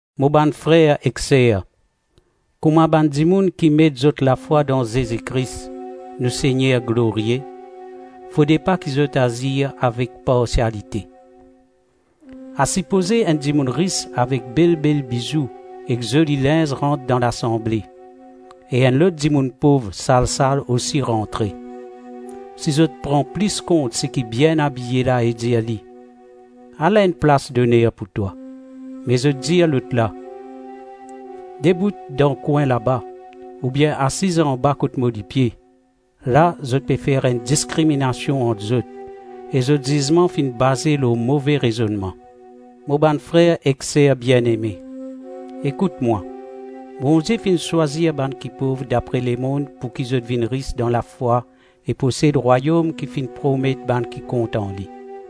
Mo bann frer ek ser, kouma bann dimoun ki met zot lafwa dan Zezi Kris, nou Segner glorie, fode pa ki zot azir avek parsialite. Asipoze enn dimoun ris avek bel-bel bizou ek zoli linz rant dan lasanble, e enn lot dimoun pov sal-sal osi rantre, si zot pran plis kont seki bien abiye la e dir li, “Ala enn plas-doner pou twa,” me zot dir lot la, “Debout dan kwin laba,” oubien “Asiz anba kot mo lipie,” la, zot pe fer enn diskriminasion ant zot, e zot zizman finn baze lor move rezonnman. Mo bann frer ek ser bieneme, ekout mwa: Bondie finn swazir bann ki pov dapre lemonn pouki zot vinn ris dan lafwa e posed rwayom ki finn promet bann ki kontan li.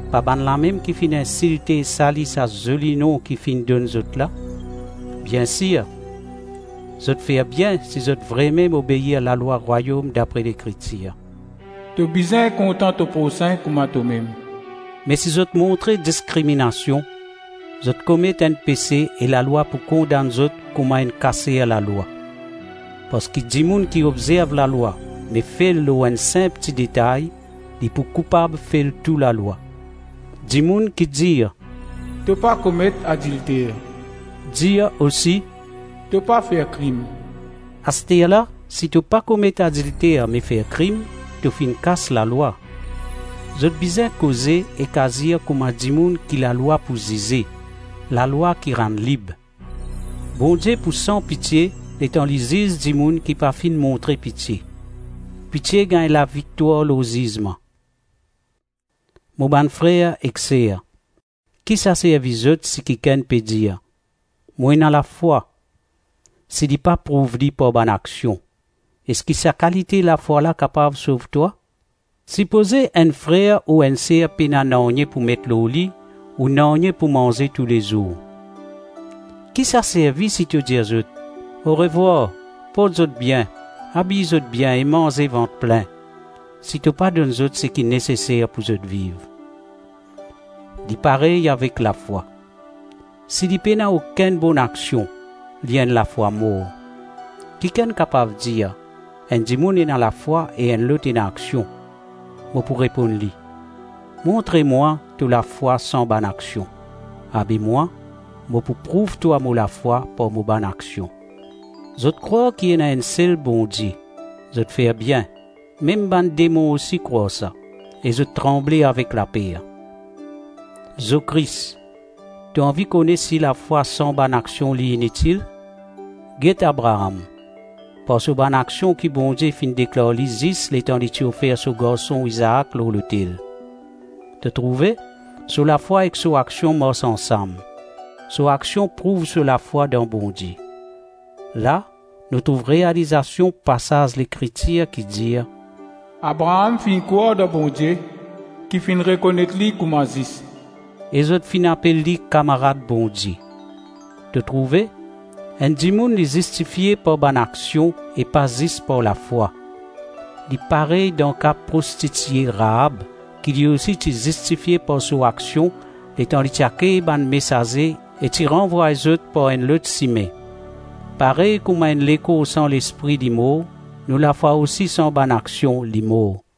Pa bannlamem ki finn insilte e sali sa zoli nom ki finn donn zot la? Bien sir, zot fer bien si zot vremem obeir lalwa rwayom dapre Lekritir, “To bizin kontan to prosin kouma tomem.” Me si zot montre diskriminasion, zot komet enn pese e lalwa pou kondann zot kouma enn kaser lalwa. Parski dimoun ki obzerv lalwa me fel lor enn sinp ti detay, li pou koupab fel tou lalwa. Dimoun ki dir, “To pa komet adilter,” dir osi, “To pa fer krim.” Asterla si to pa komet adilter me fer krim, to finn kas lalwa. Zot bizin koze ek azir kouma dimoun ki lalwa pou zize, lalwa ki rann lib. Bondie pou san pitie letan li ziz dimoun ki pa finn montre pitie; pitie gagn laviktwar lor zizman. Mo bann frer ek ser, ki sa servi zot si kikenn pe dir, “Mo ena lafwa,” si li pa prouv li par bann aksion? Eski sa kalite lafwa la kapav sov twa? Sipoze enn frer ou enn ser pena nanye pou met lor li ou nanye pou manze toulezour. Ki sa servi si to dir zot: “Orevwar, port zot bien; abiy zot bien e manze vant plin!” - si to pa donn zot seki neseser pou zot viv? Li parey avek lafwa: si li pena okenn bonaksion, li enn lafwa mor. Kikenn kapav dir; “Enn dimoun ena lafwa e enn lot ena aksion.” Mo pou reponn li: “Montre mwa to lafwa san bann aksion! Abe mwa, mo pou prouv twa mo lafwa par mo bann aksion.” Zot krwar ki ena enn sel Bondie; zot fer bien. Mem bann demon osi krwar sa - e zot tranble avek laper. Zokris! To anvi kone si lafwa san bann aksion li initil? Get Abraam, par so bann aksion ki Bondie finn deklar li zis letan li ti ofer so garson Izaak lor lotel. To trouve, so lafwa ek so aksion mars ansam; so aksion prouv so lafwa dan Bondie. La, nou trouv realizasion pasaz Lekritir ki dir: “Abraam finn krwar dan Bondie ki finn rekonet li kouma zis,” e zot finn apel li kamarad Bondie. To trouve, enn dimoun li zistifie par bann aksion e pa zis par lafwa. Li parey dan ka prostitie Raab ki li osi ti zistifie par so aksion letan li ti akey bann mesaze e ti ranvway zot par enn lot sime. Parey kouma enn lekor san lespri li mor, nou lafwa osi san bann aksion, li mor.